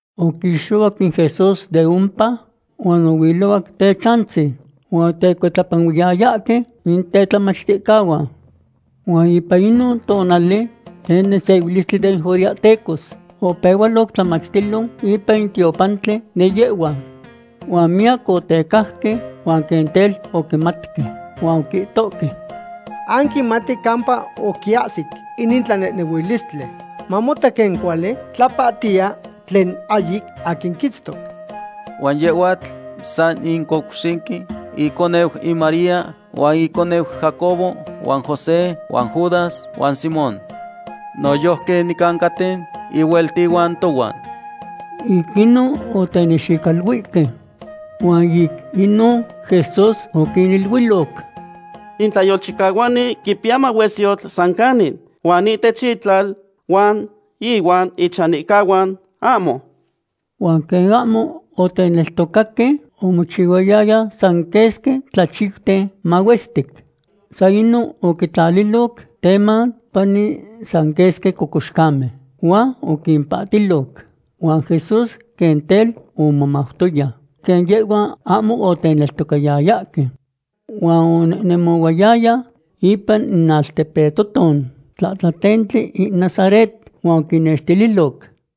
Oquixohuac in Jesús de ompa huan ohuilohuac techantzin, huan otecuitlapanuiyayahque in tetlamachticahuan. Huan ipan in tonali den nesehuilistli den judeahtecos opehualoc tlamachtilo ipan in tiopantli de yehhuan. Huan miyac otecajque huan quen tel oquimatque. Huan oquihtohque: ―Anquimati campa oquiahsic inin tlanehnehuilistli. Mamota quen cuali tlapahtiya tlen ahyic aquin quiitztoc. Huan yehhuatl san in couxinqui, iconeu in María huan icniu Jacobo huan José huan Judas huan Simón. Noyojqui nicancaten ihueltihuan tohuan. Ic inon otenexicaluihque. Huan ic inon Jesús oquiniluiloc: ―In tlayolchicahuani quipiya mahuesyotl san canin, huan ihtech itlal huan ihuan ichanihcahuan, ahmo. Huan quen ahmo oteneltocaque, omochihuayaya san quesqui tlachiuten mahuestic. San inon oquitlalililoc teman pani san quesqui cocoxcamen huan oquimpahtiloc. Huan Jesús quen tel omomautoya quen yehhuan ahmo oteneltocayayahque. Huan onehnemohuayaya ipan in altepetohton tlahtlatentli in Nazaret, huan oquinnextililoc.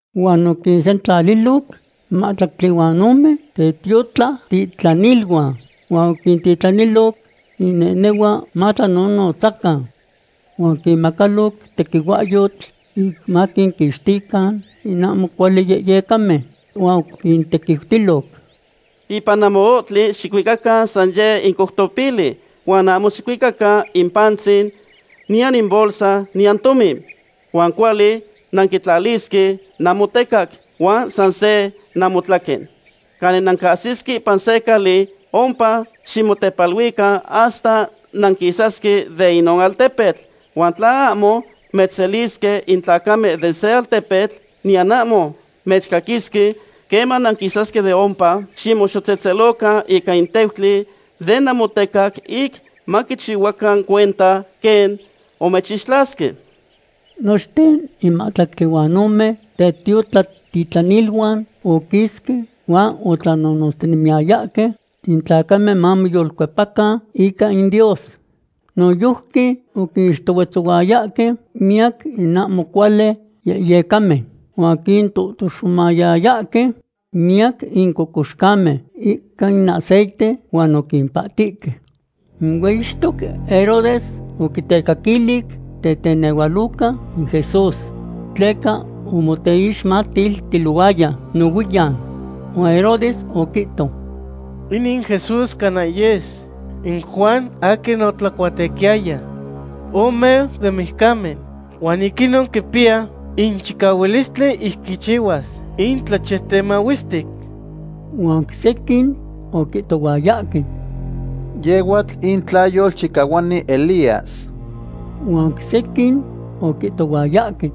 Huan oquinsentlaliloc in mahtlactli huan ome tetiotlatitlaniluan huan oquintitlaniloc inehnehuan matlanonotzacan. Huan oquinmacaloc tequihuahyotl ic maquinquixtican in ahmo cuali yehyecamen. Huan oquintequiutiloc: ―Ipan namoohtli xicuicacan san yeh in coutopili, huan ahmo xicuicacan in pantzin, niyan in bolsa, niyan tomin. Huan cuali nanquitlalisque namotecac, huan san se namotlaquen. Canin nancahsisque ipan se cali, ompa ximotepaluican hasta nanquisasque de inon altepetl. Huan tla ahmo mechselisque in tlacamen de se altpetl, niyan ahmo mechcaquisque, queman nanquisasque de ompa ximoxotzehtzelocan ica in teutli de namotecac ic maquichihuacan cuenta quen omechixtlasque. Nochten in mahtlactli huan ome tetiotlatitlaniluan oquisque, huan otlannonotztinemiyayahque in tlacamen mamoyolcuepacan ica in Dios. Noyojqui oquinixtohuetzayahque miyac in ahmo cuali yehyecamen, huan oquintohtoxomayayahque miyaquin in cocoxcamen ica in aceite huan oquimpahtihque. In hueyixtoc Herodes oquitecaquili tetenehualoca in Jesús, tleca omoteixmatiltilohuaya nohuiyan. Huan Herodes oquihto: ―Inin Jesús cana yes in Juan aquin otlacuatequiyaya. Omeu den mijcamen huan ic inon quipiya in chicahualistli ic quichihuas in tlachiuten mahuestic. Huan oc sequin oquihtohuayahque: ―Yehhuatl in tlayolchicahuani Elías. Huan oc sequin oquihtohuayahque: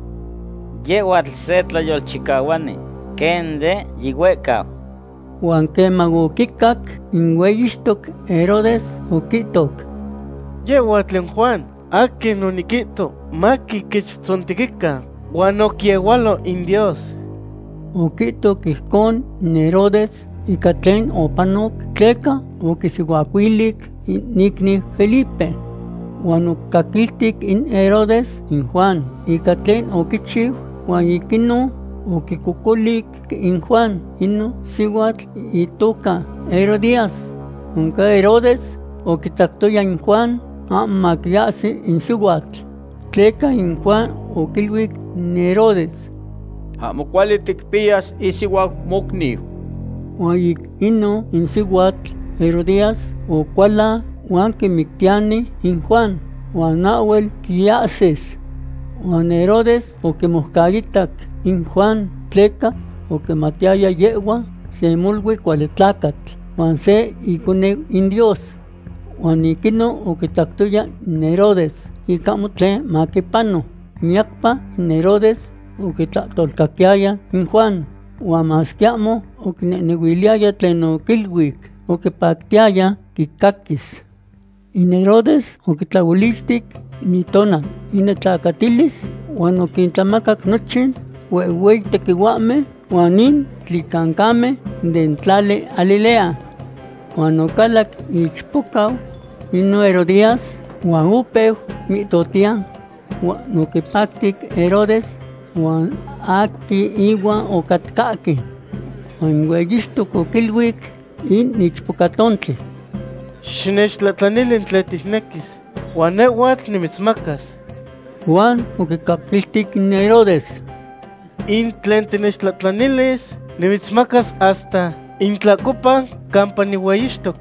―Yehhuatl se tlayolchicahuani, quen de yihuehcau. Huan queman oquicac in hueyixtoc Herodes, oquihtoc: ―Yehhuatl in Juan, aquin oniquihto maquiquechtzontequican, huan oquiehualo in Dios. Oquihtoc ijcon in Herodes ica tlen opanoc tleca oquisihuacuilic in iicniu Felipe. Huan oquicaquiltic in Herodes in Juan ica tlen oquichiu huan ic inon oquicocolic in Juan inon sihuatl itoca Herodías. Oncan Herodes oquitzactoya in Juan, ahmo maquiahsi in sihuatl. Tleca in Juan oquiluic in Herodes: ―Ahmo cuali ticpiyas isihuau mocniu. Huan ic inon in sihuatl Herodías ocualan huan quimictiyani in Juan, huan ahhuel quiahsis. Huan Herodes oquimoucaitac in Juan tleca oquimatiyaya yehhuatl se molui cuali tlacatl huan se iconeu in Dios. Huan ic inon oquitzactoya in Herodes ic ahmo tlen maquipano. Miyacpa in Herodes oquitlahtolcaquiyaya in Juan, huan masque ahmo oquinehnehuiliyaya tlen oquiluic, oquipactiyaya quicaquis. In Herodes oquitlaolichti in itonal inetlacatilis huan oquintlamacac nochin huehhueyi tequihuahmen huan in tlicancamen den tlali Galilea. Huan ocalac ichpocau inon Herodías huan opeu mihtohtiya, huan oquipacti Herodes huan aquin ihuan ocatcahque. Huan in hueyixtoc oquiluic in ichpochtontli: ―Xinechtlahtlanili tlen ticnequis, huan nehhuatl nimitzmacas. Huan oquicaquiltic in Herodes: ―In tlen tinechtlahtlanilis, nimitzmacas hasta in tlahcopa campa nihueyixtoc.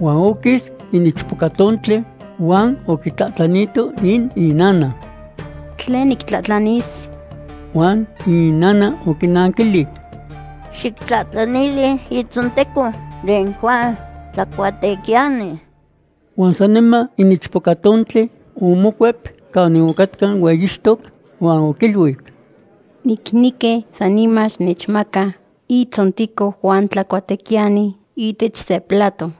Huan oquis in ichpochtontli huan oquitlahtlanito in inana: ―¿Tlen nictlahtlanis? Huan inana oquinanquilic: ―Xictlahtlanili itzonteco den Juan Tlacuatequiyani. Huan saniman in ichpochtontli omocuep canin ocatca in hueyixtoc huan oquiluic: ―Nicnequi saniman xinechmaca iitzonteco Juan Tlacuatequiyani ihtech se plato.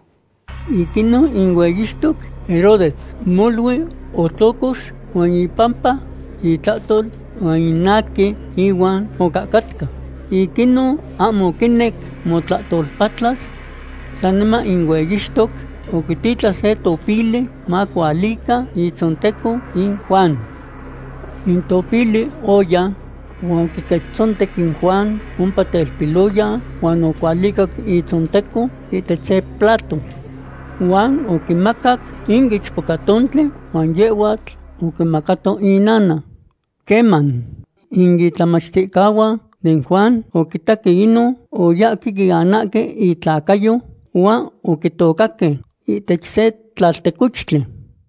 Ic inon in hueyixtoc Herodes molui otlocox, huan ipampa itlahtol huan in aquin ihuan ocahcatca, ic inon ahmo oquinec motlahtolpatlas. Saniman in hueyixtoc oquititlan se topili macualica itzonteco in Juan. In topili oya huan oquiquechtzontec in Juan ompa telpiloyan, huan ocualicac itzonteco ihtech se plato. Huan oquimacac in ichpochtontli, huan yehhuatl oquimacato inana. Queman in itlamachticahuan den Juan oquimatque inon, oyahque quianahque itlacayo, huan oquitocaque ihtech se tlaltecochtli.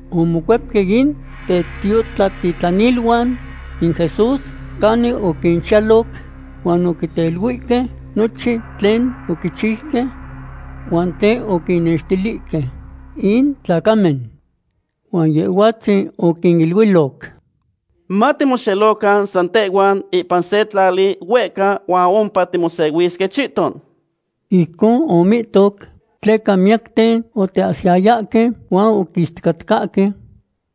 Omocuepque in tetiotlatitlaniluan in Jesús canin oquinchiyaloc huan oteiluihque nochin tlen oquinchiuque huan tlen oquinextilihque in tlacamen. Huan Yehhuatzin oquiniluiloc: ―Matimoxelocan san tehhuan ipan se tlali huehca huan ompa timosehuisque chihton. Ijcon omihto tleca miyacten oteahsiyayahque huan oquisticatcahque.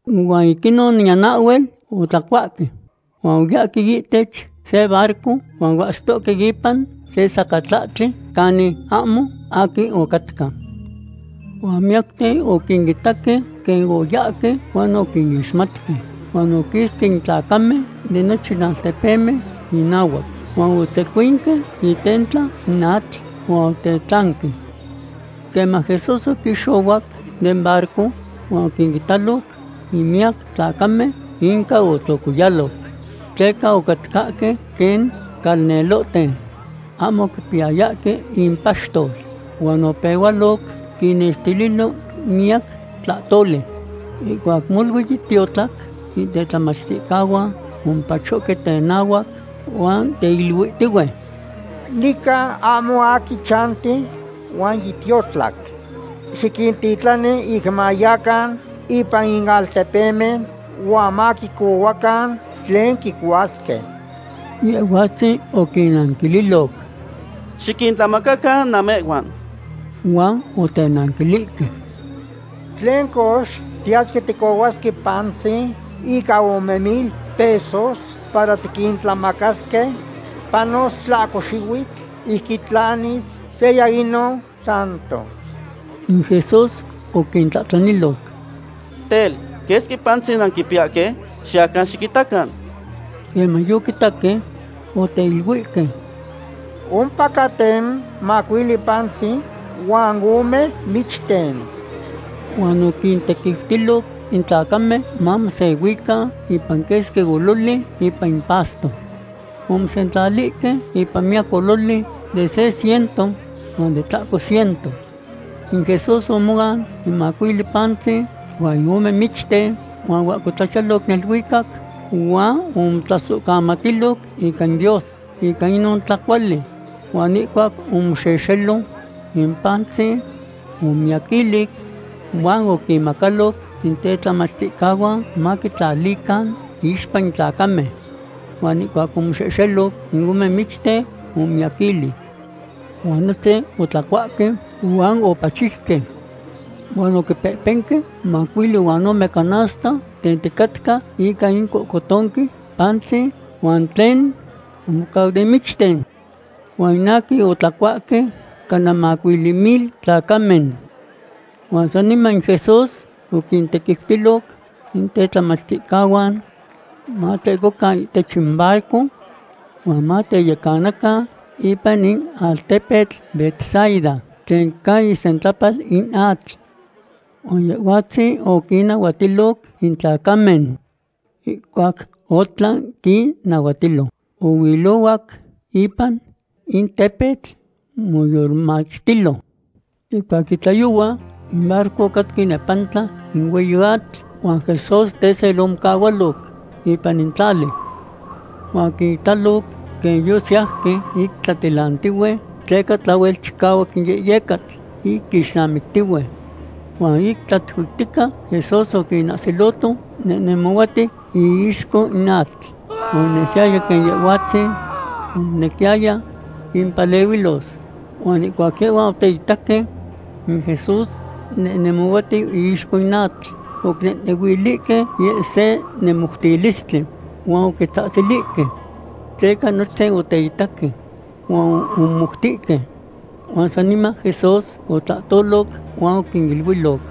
Huan ic inon niyan ahhuel otlacuahque. Huan oyahque ihtech se barco huan oahsitohque ipan se sacatlahtli canin ahmo aquin ocatca. Huan miyacten oquinitaque quen oyahque, huan oquinixmatque. Huan oquisque in tlacamen den nochin altepemen inahuac, huan otzecuinque itentla in atl huan otetlanque. Queman Jesús oquixohuac den barco huan oquinitaloc in miyac tlacamen, inca otlocoyaloc. Tleca ocatcahque quen calnelohten ahmo quipiyahque in paxtol, huan opehualoc quinnextililo miyac tlahtoli. Ihcuac molui yitiotlac, in tetlamachticahuan omopachohque tenahuac, huan teiluihtihue: ―Nican ahmo aquin chanti huan yitiotlac. Xiquintitlani ic mayacan ipan in altepemen huan maquicohuacan tlen quicuasque. Yehhuatzin oquinnanquililoc: ―Xiquintlamacacan namehhuan. Huan otenanquilihque: ―¿Tlen cox, tiyasque ticohuasque pantzin ica ome mil pesos para tiquintlamacasque? Panos tlahco xihuitl ic quitlanis seya inon tanto. In Jesús oquintlahtlaniloc: ―Tel, ¿quesqui pantzin nanquipiyahque? Xiyacan xiquitacan. Queman yoquitaque, oteiluihque: ―Ompacaten macuili pantzin huan ome michten. Huan oquintequiutiloc in tlacamen mamosehuican ipan quesqui ololi ipan in pasto. Omosentlalihque ipan miyac ololi de se ciento huan de tlahco ciento. In Jesús omoan in macuili pantzin huan in ome michten, huan oahcotlachiyaloc neluicac huan omotlasohcamatiloc ica in Dios ica inon tlacuali. Huan ihcuac omoxehxelo, in pantzin omomiyaquilic. Huan oquinmacaloc in tetlamachticahuan, maquitlalican iixpa in tlacamen. Huan ihcuac omoxehxelo in ome michten, omomiyaquilic. Huan nochten otlacuahque huan opachiuque. Huan oquipehpenque mahtlactli huan ome canasta tenticatca ica in cohcotonque pantzin, huan tlen omocau den michten. Huan in aquin otlacuahque cana macuili mil tlacamen. Huan saniman in Jesús oquintequiutiloc in tetlamachticahuan matlehcocan ihtech in barco huan mateyecanacan ipan in altepetl Betsaida tlen ca isentlapal in atl. Huan Yehhuatzin oquinnahuatiloc in tlacamen. Ihcuac otlan quinnahuatilo, ohuilohuac ipan in tepetl moyolmachtilo. Ihcuac yitlayohua, in barco ocatca inepantla in hueyi atl, huan Jesús tesel omocahualoc ipan in tlali. Huan oquinitaloc quen yosiyauque ic tlaatilantihue, tleca tlahuel chicahuac in yehyecatl ic quixnamictihue. Huan ic tlatuihtica, Jesús oquinahsiloto nehnemohuatiu iixco in atl. Huan onesiyaya quen Yehhuatzin omonequiyaya quimpanahuilos. Huan ihcuac yehhuan oteitaque in Jesús nehnemohuatiu iixco in atl, oquinehnehuilihque yeh se nemohmoutilistli, huan oquitzahtzilihque. Tleca nochten oteitaque huan omomoutihque. Huan saniman Jesús otlahtoloc huan oquiniluiloc: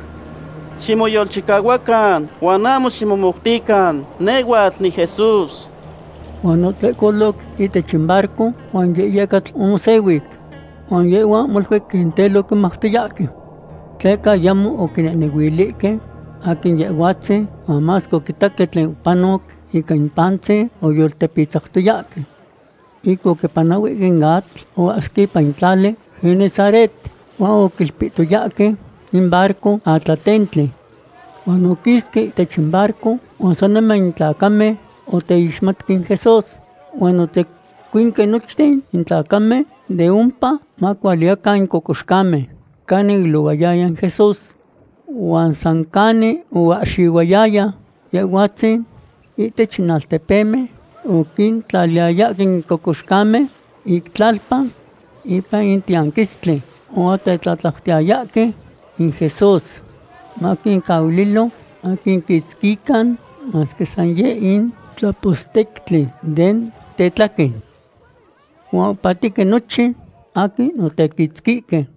―¡Ximoyolchicahuacan huan ahmo ximomoutican! Nehhuatl niJesús. Huan otlehcoloc ihtech in barco huan in yehyecatl omosehuic. Huan yehhuan molui quen tel oquimautoyahque. Tleca ayamo oquinehnehuilihque aquin Yehhuatzin, huan masque oquitaque tlen opanoc ica in pantzin, oyoltepitzautoyahque. Ic oquipanahuihque in atl, oahsique ipan in tlali Genesaret, huan oquilpihtoyahque in barco atlatentli. Huan oquisque ihtech in barco huan saniman in tlacamen oteixmatque in Jesús. Huan otzecuinque nochten in tlacamen de ompa macualican in cocoxcamen canin oilohuaya in Jesús. Huan san canin oahxihuayaya Yehhuatzin ihtech in altepemen, oquintlaliyayahque in cocoxcamen ic tlalpan ipan in tiyanquistli huan otetlatlautiyayahque in Jesús maquincahuililo maquiquitzquican masque san yeh in tlapostectli den tetlaquen. Huan opahtihque nochin aquin otequitzquihque.